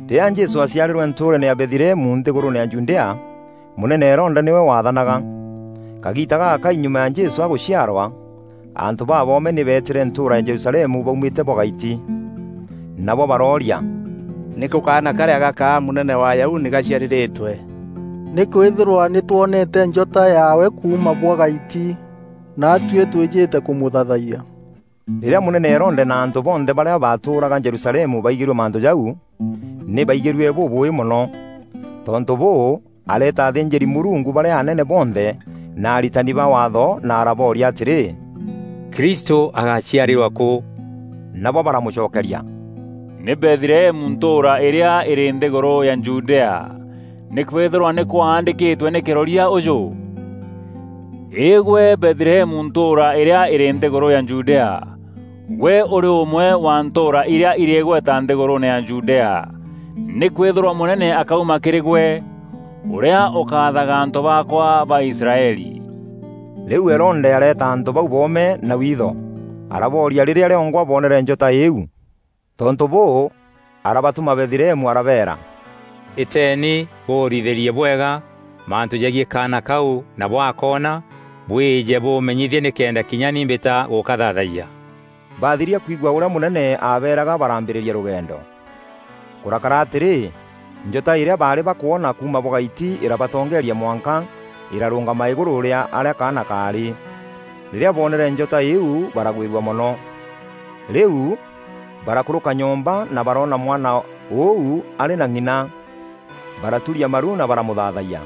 Rîrîa Jesû aaciarîrwe ntûûreene ya Bethlehemu nthîgûrûûne ya Judea, mûnene Herode nîwe waathanaga. Kagiita gagakai nyuma ya Jesû agûciarwa, antû baboome nî beetîre ntûûra ya Jerusalemu baumîte bwa gaiti. Nabo barooria, “Nîkû kaana karîa gakaa mûnene wa Ayahudi gaciarîîrîtwe? Nîkwîthîrwa nî twonete njota yaawe kuuma bwa gaiti, naatuî twîjîte kûmûthaathayia.” Rîrîa mûnene Herode na antû bonthe barîa baatûûraga Jerusalemu baigîrue mantû jau, nî baigîrue bûbûûî mono. Tontû bûû, areeta athînjîri-Mûrungu barîa anene bonthe na aritani ba Waatho na arabooria atîrî, “Kristû agaciarîrwa kû?” Nabo baramûcokeria, “Nî Bethlehemu ntûûra îrîa îrî nthîgûrû ya Judea, nîkwîthîrwa nî kwaandîkîtwe nî kîroria ûjû: ‘Î gwe Bethlehemu ntûûra îrîa îrî nthîgûrû ya Judea, gwe ûrî ûmwe wa ntûûra irîa irî îgweta nthîgûrûûne ya Judea; nîkwîthîrwa mûnene akauma kîrî gwe, ûrîa ûkathaga antû baakwa ba Israeli.’” Rîu Herode areeta antû bau boome na witho, arabooria rîrîa rîongwa boonere njota îîu. Tontû bûû, arabatûma Bethlehemu arabeera, “Îteeni bûûrithîrie bwega mantû jegiî kaana kau na bwakoona, bwîje bûmenyîthie nîkenda kinya ni mbîta gûkathaathayia.” Bathiria kwigua ûrîa mûnene aabeeraga, baraambîrîria rûgendo. Kûrakara atîrî, njota îrîa baarî bakwona kuuma bwa gaiti îrabatongeeria mwanka îrarûngama îgurû rîa arîa kaana kaarî. Rîrîa boonere njota îîu baragwîrua mono. Rîu, barakûrûka nyomba na baroona mwana ûu arî na ng'ina, baraturia maru na baramûthaathayia.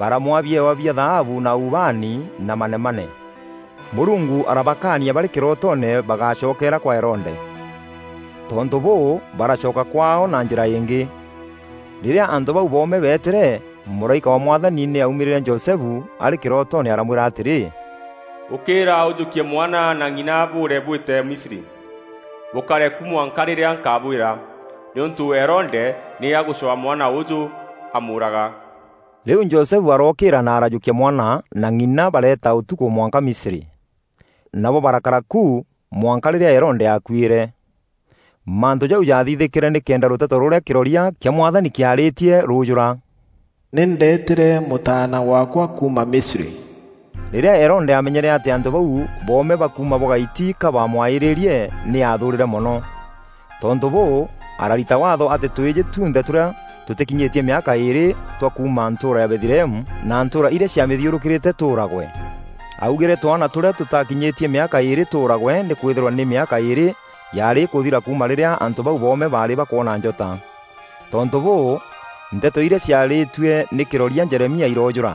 Baramwaa biewa bia thaabu na ubaani na manemane. Mûrungu arabakaania barî kîrootoone bagácokeera kwa Herode. Tontû bûû, baracoka kwaao na njîra îngî. Rîrîa antû bau boome beetîre mûraîka wa Mwathani nî aumîrîîre Josefu arî kîrootoone aramwîra atîrî, “Ûkîîra ûjûkie mwana na ng'ina bûûre bwîte Misri. Bûkare kû mwanka rîrîa nkabwîra, nîûntû Herode nî agûcwaa mwana ûûjû amûûraga.” Rîu Josefu arookîîra na arajûkia mwana na ng'ina bareeta ûtukû mwanka Misri. Nabo barakara ku mwanka rîrîa Herode aakuîre. Mantû jau jaathithîkîre nîkenda rûteto rûrîa kîroria kîa Mwathani kîaarîtie rûûjûra: “Nî ndeetîre Mûtaana waakwa kuuma Misri.” Rîrîa Herode aamenyere atî antû bau boome ba kuuma bwa gaiti ka bamwaîrie nî aathûûrîre mono. Tontû bûû, ararita Waatho atî tûîjî tunthe tûrîa tûtîkinyîtie mîaka îîrî twa kuuma ntûûra ya Bethlehemu na ntûûra irîa ciamîthîûrûkîrîte tûûragwe. Augîre twaana tûrîa tûtakinyîtie mîaka îîrî tûûragwe nîkwîthîrwa nî mîaka îîrî yaarî îkûthîra kuuma rîrîa antû bau boome baarî bakwona njota. Tontû bûû, nteto irîa ciarîîtue nî kîroria Jeremia irojûûra: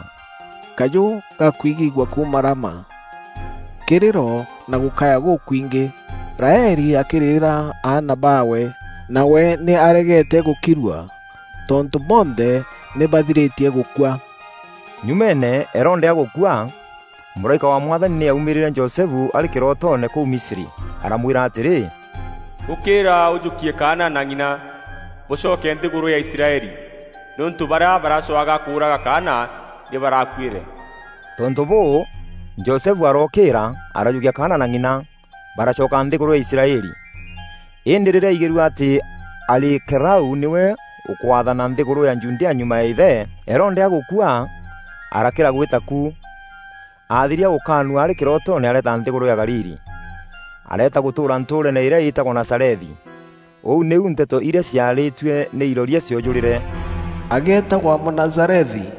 “Kajû gakwigîîgua kuuma Rama, kîrîro na gûkaya gûkwingî. Raeli akîrîrîra aana baawe, nawe nî aregeete gûkirua. Tontû bonthe nî bathirîtie gûkua.” Nyumeene, Herode agûkua, mûraîka wa Mwathani nî aumîrîîre Josefu arî kîrootoone kûu Misri aramwîra atîrî, “Ûkîîra ûjûkie kaana na ng'ina, bûcoke nthîgûrû ya Israeli, nîûntû barîa baracwaga kûûraga kaana nî barakuîre.” Tontû bûû, Josefu arookîîra, arajûkia kaana na ng'ina, baracoka nthîgûrû ya Israeli. Îndî rîrîa aigîrue atî Arikelaû nîwe ûkwaathana nthîgûrû ya Judea nyuma ya îthe, Herode agûkua, arakîra gwîta ku. Aathiria gûkaanua arî kîrootoone areeta nthîgûrû ya Galili. Areeta gûtûûra ntûûreene îrîa îtagwa Nazarethi. Ûu nîu nteto irîa ciarîîtue nî iroria ciojûrîre: “Ageetagwa Mûnazarethi.”